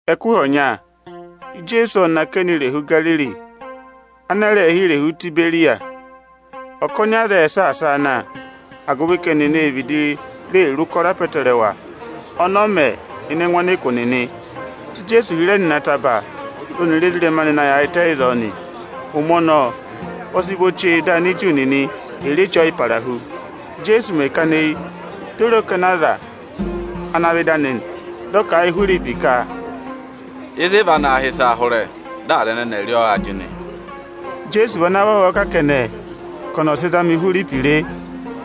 Ẹkụhị ọnya, Ijeesu ộ nọ akẹnẹ irehu Igariri, ana a rẹẹ̄ hị́ irehu Itiberiyasi. Ọkọnị aza ệ saasa a na, agụvị ka ẹnịnị ê vịdị re ụkọrọ apọtẹrẹwa ọnị ọ mẹ ịnị ẹngụ ọnịkụ nịnị. Dị Ijeesu hịrẹ nọ ịnị ataba, dị ọnịrị ezirẹma anị yaayịtẹ ịzọọ nị. Ụmẹ ọnọọ, ọ sị vọ chee di Aniju nịnị ẹ̀ rị Eche Ọyịparahu. Íjeesu mẹ̀ kana eyi, di o re ọkọnị aza ana aa vẹ ịdị anị; dị ọ kà a yị Ihwiripi ka, “Ịzị ị va naa hị́ ịsaa hụrẹ vaa yị aza ẹnẹnị aanị?” Ijeesu vị ana vavọọ kà kẹnẹ ka ọnị ọ̀ sị zama Ihwiripi re,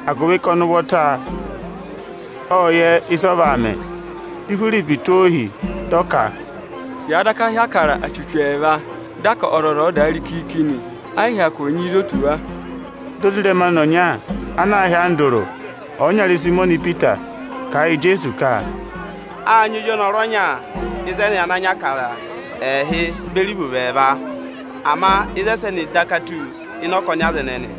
agụvị ka ọnị ụvọta ộ yẹ ịsị ọ vaa mẹ. Dị Ihwiripi tụ́ o ohi, dị ọ ka, “Yàa daka hị́ Ịbụrẹẹdị achuchu ẹẹva, dị a ka ọzọza ọ̀ dà rị kiiki nị, ẹ yị hyakụ nyị ịzị o tù wa.” Dị ozirẹma anị ọnya ana aā hị́ Andụrụ, ọyịnyara Ịsayịmọnị Ipita, kà a yị Ijeesu ka: “Â nyị ozi ọnọrụ ọnya ịzẹnị ana nyị Ịbụrẹẹdị ẹẹhị beri ivovo ẹẹva. Ama ịzị ẹsẹnị daka tù ịnị ọkọnị aza ẹnẹnị?”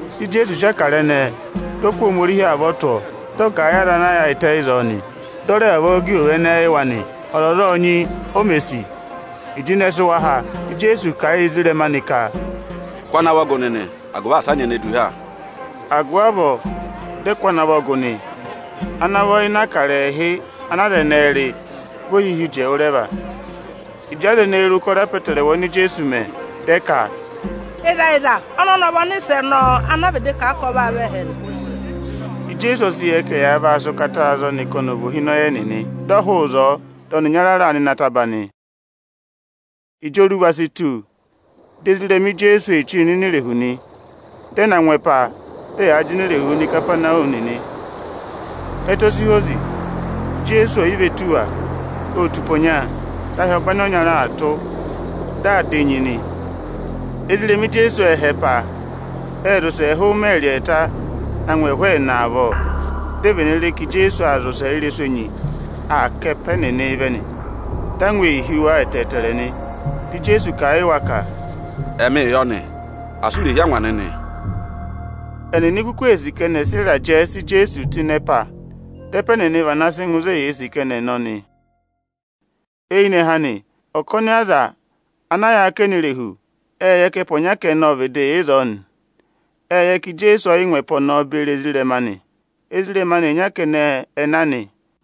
Dị Ijeesu sị Ịbụrẹẹdị ẹnẹẹ, dị ọ kụ́ Ohomorihi avọ tụ́ ọọ, dị ọ ka à gà ẹ yị aza ana yaayịtẹ ịzọọ nị. Dị ọ ka à rẹ vavọọ gà ivovo ẹnẹ yị wa nị. Ọzọza ộ nyị, o mè sì. Ịjị ịnẹ sị wa há, dị Ijeesu kà a yị ezirẹma anị ka, “Kụ́ ana vọ gụ nịnị, agụvị asị a nyị ene du ha!” Agụvị avọọ dị ẹ kụ́ ana vọ gụ nị. Ana vọ ịnị Ịbụrẹẹdị ẹẹhị ana aza ẹnẹẹ rị, vị ohihi uji ẹwụrẹva. Ịjị aza ẹnẹẹ re ụkọrọ apọtẹrẹwa oni Ijeesu mẹ, dị ẹ ka, “Ịzẹyịza, ọza ọnọnị ọ vị Ọnịsẹ ọnọọ ana a vịdị kà a ka ọ vaa vẹ ẹhẹ nị.” Ijeesu ọ sị yẹ ka ẹyaa vaa sị ụkataa za ọnị ka ọnị ọ̀ vị ohinọyị ẹnịnị; dị ọ hụụ ịzọọ, dị ọnị ịnyara raa nọ ịnị ataba nị. Ịjị oruva si tù, dị ezirẹma Ijeesu ee chíi nọ ini irehu nị. Ẹ́ na ngụ ẹpa, dị ẹyaa jịnẹ irehuu nọ Ikapanawumi nị. Ẹtẹ o si hozi. Ijeesu ô yi ve tù wa. Ô tù ụpẹ ọnya, dị ahị ọbanyị ọnyara aa tụ́, dị aa dà enyi nị. Ezirẹma Ijeesu ệ họ̀ ẹpa, ẹ́ zị ụsẹ ẹhụụ ịmẹẹrị ẹẹta na ngụ ẹhụụ ẹẹna avọọ, di e vene re ka Ijeesu aa zị ụsẹ ị́rẹsụ enyi, dị aa ká ẹpa ẹnịnị vẹ nị. Angwa ô hí wa ẹtẹẹtẹrẹ. Dị Ijeesu kà a yị wa ka, “Ẹmịị yọ nị, asị u rè hí angwa nịnị!” Ẹnịnị kuku ee sì ka ẹnị ẹ̀ sị ịrajẹ sị Ijeesu tụ́ ịnị ẹpa, dị ẹpa ẹnịnị vana sị ngụ ịzị eyee sì ka ẹnị ẹ̀ nọ nị. Eyinẹhẹ anị, ọkọnị aza ana yị yà akẹnẹ irehu, ệ yẹ ka ẹpa ọnya kẹnẹ ọ vịdị yà ịzọọ nị. Ệ yẹ ka Ijeesu ọ yị ngụ ẹpa ọnọọ beri ezirẹma anị; ezirẹma anị ịnya kẹnẹ ẹ na nị.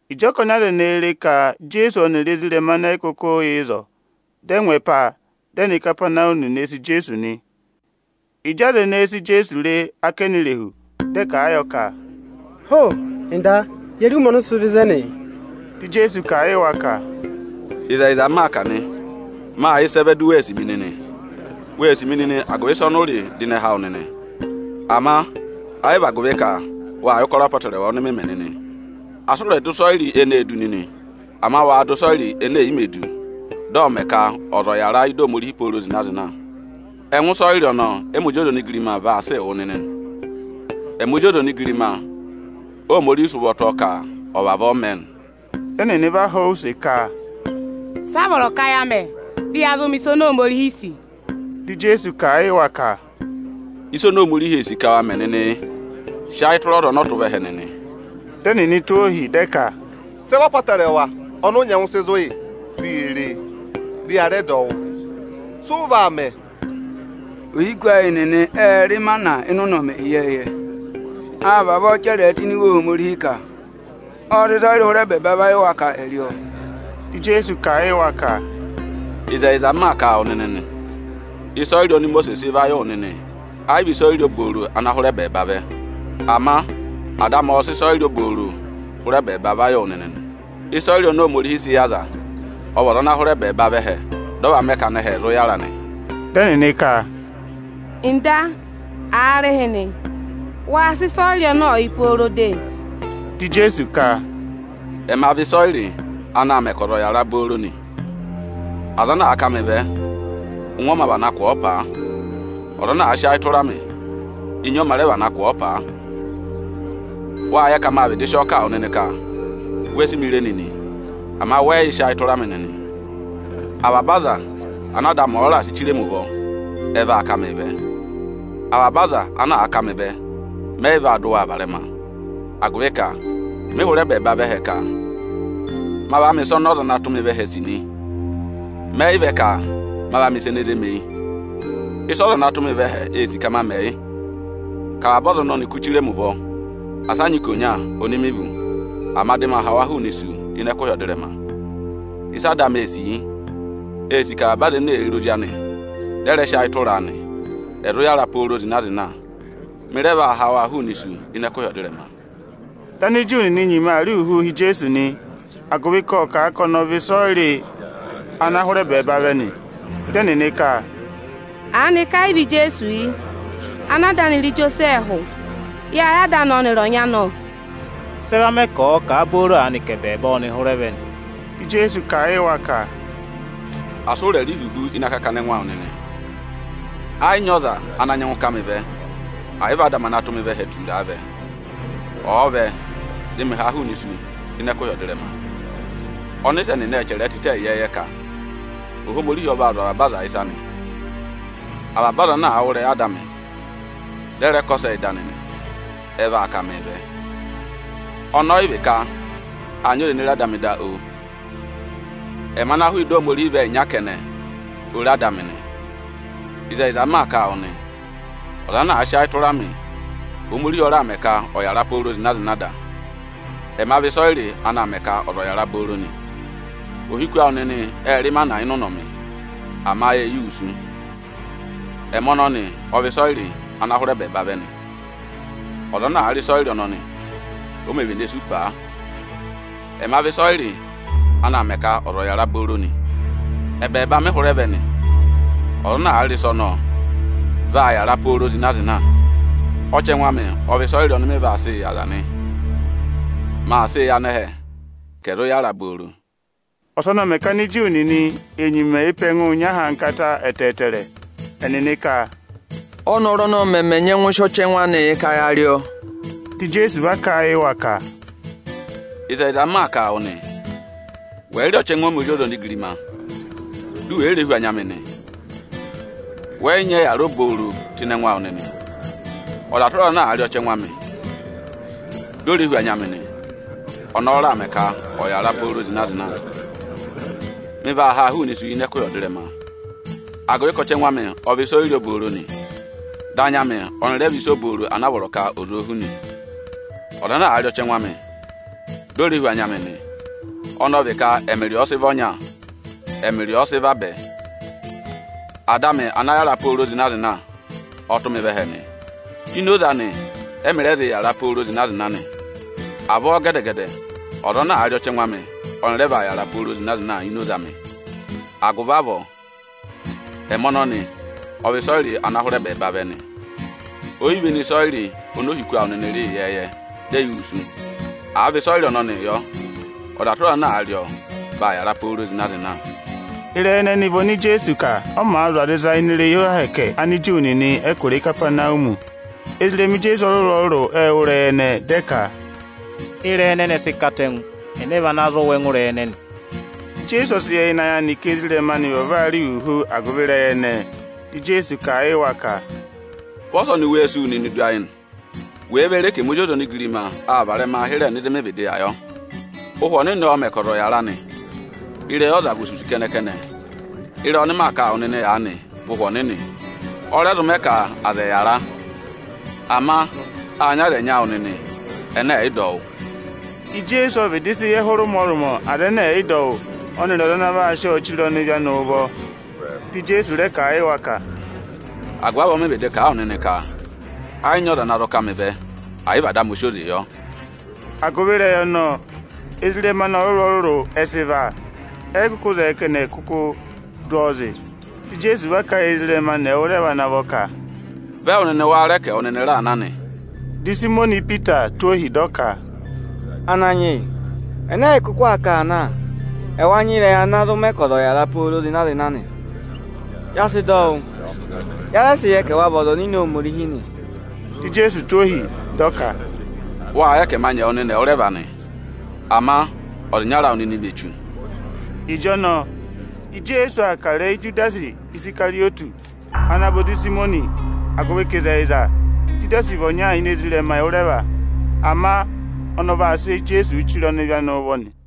Ịjị ọkọnị aza ẹnẹẹ re ka Ijeesu ọnịrị ezirẹma anị ẹ yị kụkụ yà ịzọọ, dị ẹ ngụ ẹpa, dị ẹ nọ Ikapanawumi ne ee sì Ijeesu nị. Ịjị aza ẹnẹẹ si Ijeesu re ákẹnẹ irehu, dị ẹ kà a yọ ka, “Ho! Ọga, ye re ụmẹ ọnị ụ sị vẹ ịzẹnị?” Dị Ijeesu kà a yị wa ka, “Ịzẹyịza m maa kà nị, mâ yẹ ịsị ẹ vẹ di u wee sì mi nịnị. Wee sì mi nịnị agụvị ịsa ọnị ụ rị dị ịnẹ há wụ nịnị; ama ẹ yị vị, agụvị ka wâ yẹ ụkọrọ apọtẹrẹwa ọnị mị mẹ nịnị. Asị ụ rẹ̀ dụ ịsọyịrị eneē du nịnị! Ama waa dụ ịsọyịrị ene è yi mē du nịnị, dị ọọ̄ mẹ̀ ka ọza ọ̀ yàra ị́dị Ohomorihi pooro zịna-zịna. Ẹngụ ịsọyịrị ọnọọ ẹ́mị Ozi ọza onigirima vaa sịị wụ nịnị nị. Ẹmị Ozi ọza onigirima Óhomorihi sị ụvọ tụ́ ọọ ka ọ̀ vavọọ mẹ nị.” Dị ẹnịnị va họ̀ ọ use ka, “Sị a vọrọ ka ya mẹ, dị ya zụ mẹ̀ ịsa oni Ohomorihi sì?” Dị Ijeesu kà a yị wa ka, “Ịsa oni Ohomorihi ee sì ka wa mẹ nịnị, yị: Sị ayị tụra ọza ọnị ọ tụ́ vẹ ẹhẹ nịnị!” Dị ẹnịnị tụ́ ohi, dị ẹ ka, “Sị ẹ vị apọtẹrẹwa ọnị ụ nyẹngụ sị zụ̀ yị, di ye re e, dị ya rẹ dọ wụ wụ́? Sị ụ vaa mẹ? Ohiku ayị nịnị ệ rị ịmana ịnị ụnọmị ịyẹẹyẹ. Â vavọọ chẹrẹ ẹ tụ́ ini Iwe Ohomorihi ka: ‘Ộ sị ịsọyịrị hụrẹ ẹbẹẹba va yị wa ka ẹ̀ rị ọọ.’” Dị Ijeesu kà a yị wa ka, “Ịzẹyịza m maa kà a wụ nịnị nị: Ịsọyịrị oni Imosiisi sị va yị wụ nịnị, ẹ yị vị ịsa obooro ana hụrẹ ẹbẹẹba vẹ. Ama Ada amị ọ sị ịsọyịrị obooro hụrẹ ẹbẹẹba va yị wụ nịnị nị. Ịsọyịrị oni Ohomorihi sị yị aza, ọ vị ọza ana hụrẹ ẹbẹẹba vẹ ẹhẹ, dị ọ va mẹ ka anẹhẹ ẹ̀ zụ yàra nị.” Dị ẹnịnị ka, “Ọga, aarịhịnị, waa sị ịsọyịrị ọnọọ yị pooro de!” Dị Ijeesu ka, “Ẹma vị ịsọyịrị anaā mẹ ka ọza ọ̀ yàra booro nị. Ọza ana àa ká mị vẹ, ụngwẹ ọ mā vana kụ̀ ọ paa. Ọza ana àa sị ayị tụra mị, enyi ọ mā rẹ vana kụ̀ ọ paa. “Wâ yẹ ka mâ vịdị sị ọọ kà wụ nịnị ka we si mi re nịnị, ama wẹ yị yị sị ayị tụra mị nịnị. Avaba aza ana Ada amị ọ̀ọ raà sị chire mi ụvọ, ẹ vaa ká mịị vẹ. Avaba aza ana àa ká mị vẹ, mẹ yị vaa dị waa varẹma; agụvị ka mị hụrẹ ẹbẹẹba vẹ ẹhẹ ka ma va mẹ̀ ịsa ọnị ọza ana tụ́ mị vẹ ẹhẹ sì nị. Mẹ yị vẹ ka ma va mẹ̀ ịsa ene zé mi eyi. Ịsị ọza ana tụ́ mị vẹ ẹhẹ sì ka ma mẹ, yị: ka avaba aza ọnị ọnị kụ́ chire mi ụvọ, asa a nyị ikonya oni mi vú; ama dị ma ha wa hụụnị isu ịnị ẹkụhị ọdịrẹma. Ịsị Ada amị ee sì, yị: Ee sì ka avaba aza ene èe re Ozi anị, dị ẹ rẹ sị ayị tụra a nị, ẹ̀ zụ yàra pooro zịna-zịna; mị rẹ vaa ha waa hụụnị isu ịnị ẹkụhị ọdịrẹma.” Dị Aniju nịnị nyima aa rị ihuhuu hi Ijeesu nị, agụvị ka ộ kà a ka ọnị ọ vị ịsọyịrị ana hụrẹ ẹbẹẹba vẹ nị. Dị ẹnịnị ka, “Aanịka ẹ yị vị Ijeesu yị, ana ada anị rị Ijosẹẹhụ? Yâ yẹ ada anị ọnịrị ọnyị anị, ọ! Sị ẹ va mẹ ka ọ̀ọ kà a booro aanị ka ẹbẹẹba ọ́nị hụrẹ vẹ nị?” Dị Ijeesu kà a yị wa ka, “Asị ụ rẹ̀ rị ihuhu ịnị akakana ẹngụ awụ nịnị! Ẹ yị nyị ọza ana nyẹngụ ká mị vẹ, ẹ̀ yị vị Ada amị ana tụ́ mị vẹ ẹhẹ tura a vẹ. Ọ̀ọ vẹ, dị mị haa hụụnị isu ịnị ẹkụhị ọdịrẹma. Ọnịsẹ nịnị ệ chẹrẹ ẹ tịtẹ ịyẹẹyẹ ka: ‘Ohomorihi ọ vaa zụ̀ avaba aza ịsa nị.’ Avaba ọza ana àa wụ́ ịrẹyị Ada amị, dị ẹ rẹ kọsẹ ị́dị anị nị, ẹ vaa ká mịị vẹ. Ọnọọ ọ yị vị ka â nyị ọza ene re Ada amị tụ́ eyi da, oo! Ẹmị ana hụụ ịdị Ohomorihi vẹ ịnya kẹnẹ, o re Ada amị nị. “Ịzẹyịza m maa kà a wụ nị, ọza ana àa sị ayị tụra mị, Ohomorihi ọ raà mẹ ka ọ̀ yàra pooro zịna-zịna da. Ẹma vị ịsọyịrị anaā mẹ ka ọza ọ̀ yàra booro nị. Ohiku awụ nịnị ệ rị ịmana ịnị ụnọmị, ama e yi wusu. Ẹmị ọnọnị ọ vị ịsọyịrị ana hụrẹ ẹbẹẹba vẹ nị, ọza ana àa rị ịsọyịrị ọnọnị, o mē vene sú paa. Ẹma vị ịsọyịrị anaā mẹ ka ọza ọ̀ yàra booro nị. Ẹbẹẹba mị hụrẹ vẹ nị. Ọza ana àa rị ịsa ọnọọ, vaa yàra pooro zịna-zịna. Ọchẹngụ amị ọ vị ịsọyịrị ọnị mị vaa sị yị aza nị. Maa sịị yị anẹhẹ ka ẹ̀ zụ yàra obooro.” Ọsọnị ộ mẹ̀ ka Aniju nịnị è nyima ee pe ẹngụụ nyị ahankata ẹtẹẹtẹrẹ. Ẹnịnị ka, “Ọ́nọrụ ọnọnị mẹmẹ nyẹngụ sị ọchẹngụ anịị yị ka ya rị ọọ?” Dị Ijeesu va kà a yị wa ka, “Ịzẹyịza m maa kà a wụ nị, wẹ̀ yị rị ọchẹngụ ẹmị Ozi ọza onigirima, di u we re hú anya amị nịnị, wẹ yị va zụụ yara obooro nịnị. Ọza tụra ọza ana àa rị ọchẹngụ amị, di o re hú anya amị nị, ọnọọ ọ raà mẹ ka ọ̀ yàra pooro zịna-zịna. Mị vaa haa hụụnị isu ịnị ẹkụhị ọdịrẹma, agụvị ka ọchẹngụ amị ọ vị ịsọyịrị obooro nị, dị anya amị ọnị rẹ vị ịsa obooro ana a vọrọ ka ọza ò hù nị. Ọza ana àa rị ọchẹngụ amị, di o re hú anya amị nị, ọnọọ vị ka ẹmị rị ọọ ọ sị vị ọnya, ẹmị rị ọọ ọ sị vabẹ. Ada amị ana yàra pooro zịna-zịna ọ tụ́ mị vẹ ẹhẹ nị. Ini oze anị ẹ́mị rẹ zị yàra pooro zịna-zịna nị. Avọọ gẹdẹ-gẹdẹ, ọza ana àa rị ọchẹngụ amị, ọnị rẹ vaa yàra pooro zịna-zịna ini oze amị. Agụvị avọọ, ẹmị ọnọnị ọ vị ịsọyịrị ọnọọ ana hụrẹ ẹbẹẹba vẹ nị. O yi véné ịsọyịrị oni ohiku awụ nịnị rị ịyẹẹyẹ, di e yi wusu. Àa vị ịsọyịrị ọnọnịị yọ, ọza tụra ọza ana àa rị ọọ, vaa yàra pooro zịna-zịna.” Ịrẹyị ẹnẹnị vị oni Ijeesu kà, ọ màa zụ̀ aza ịsa ini irehi Ohomorihi Aniju nịnị ẹkụra Ikapanawumi. Ezirẹma Ijeesu ọrụrụ-ọrụrụ ệ wụ́ ịrẹyị ẹnẹẹ, dị ẹ ka, “Ịrẹyị ẹnẹnị ẹ sị katẹngụ, ẹnẹ vana zụ wụ́ ẹngụ ịrẹyị ẹnẹnị da?” Ijeesu ọ sị yẹ ịnị ayị anị ka ezirẹma anị vavọọ aa rị ihuhu agụvị ịrẹyị ẹnẹẹ. Di Ijeesu kà a yị wa ka, “Vị ọsọnị wéé si wu nịnị du ayị nị? Wèe ve re ka ẹmị Ozi ọza onigirima aa varẹma hịrẹẹ nọ ịzị mị vịdị yà yọ? Ụhwẹ Ọnịnị ọọ̄ mẹ̀ ka ọza ọ̀ yàra nị; ịrẹyị ọza vị osusu kẹnẹ-kẹnẹ. Ịrẹyị ọnị maa kà a wụ nịnị aanị vị Ụhwẹ Ọnịnị, ọ rẹ zụ mẹ ka aza ẹ̀ yàra. Ama â nyị aza ẹnyị awụ nịnị, ẹnẹ ẹ̀ yị dọ wụ́.” Ijeesu ộ vịdị sị yẹ hụrẹ ụmọrụmọ aza ẹnẹ ẹ̀ yị dọ ọnị wụ́ ọnịrị ọza ana vaa sị ọnịị chire ọnịvị anị ụvọ. Dị Ijeesu rẹ kà a yị wa ka, “Agụvị avọọ mị vịdị kà a wụ nịnị ka ẹ yị nyị ọza ana zụ ká mị vẹ, ẹ̀ yị vị Ada amị o si oze yọ.” Agụvị ịrẹyị ọnọnị, ezirẹma anị ọrụrụ-ọrụrụ ẹ sị và, ẹ yị kụkụ zẹẹ ka ẹnị ẹ̀ kụkụụ dụ ọọ zị. Dị Ijeesu va kà a yị ezirẹma anị ẹwụrẹva ana vọ ka, “Vị ẹwụ nịnị wáá rẹ ka ẹwụ nịnị raa na nị?” Dị Ịsayịmọnị Ipita tụ́ ohi, dị ọ ka, “Ananyị yị, ẹnẹ ẹyị kụkụ aa káa na? Ẹwa nyị ịrẹyị ana zụ mẹ ka ọza ọ̀ yàra pooro zịna-zịna nị. Ya sị dọ wụ́, ya rẹ sị yẹ ka ẹwa vị Ọza Ọnịnị Ohomorihi nị.” Dị Ijeesu tụ́ ohi, dị ọ ka, “Wâ yẹ ka ẹma nyị ẹwụ nịnị ẹwụrẹva nị. Ama ọza ịnyara awụ nịnị vị echu.” Ịjọnọọ, Ijeesu aa kà ịrẹyị Ijudasi Isikarịyọtị, ana vị ozi Ịsayịmọnị; agụvị ka ịzẹyịza, Ijudasi vị ọnya ini ezirẹma ẹwụrẹva, ama ọnị ọ vaa sị Ijeesu chire ọnịvị anị ụvọ nị.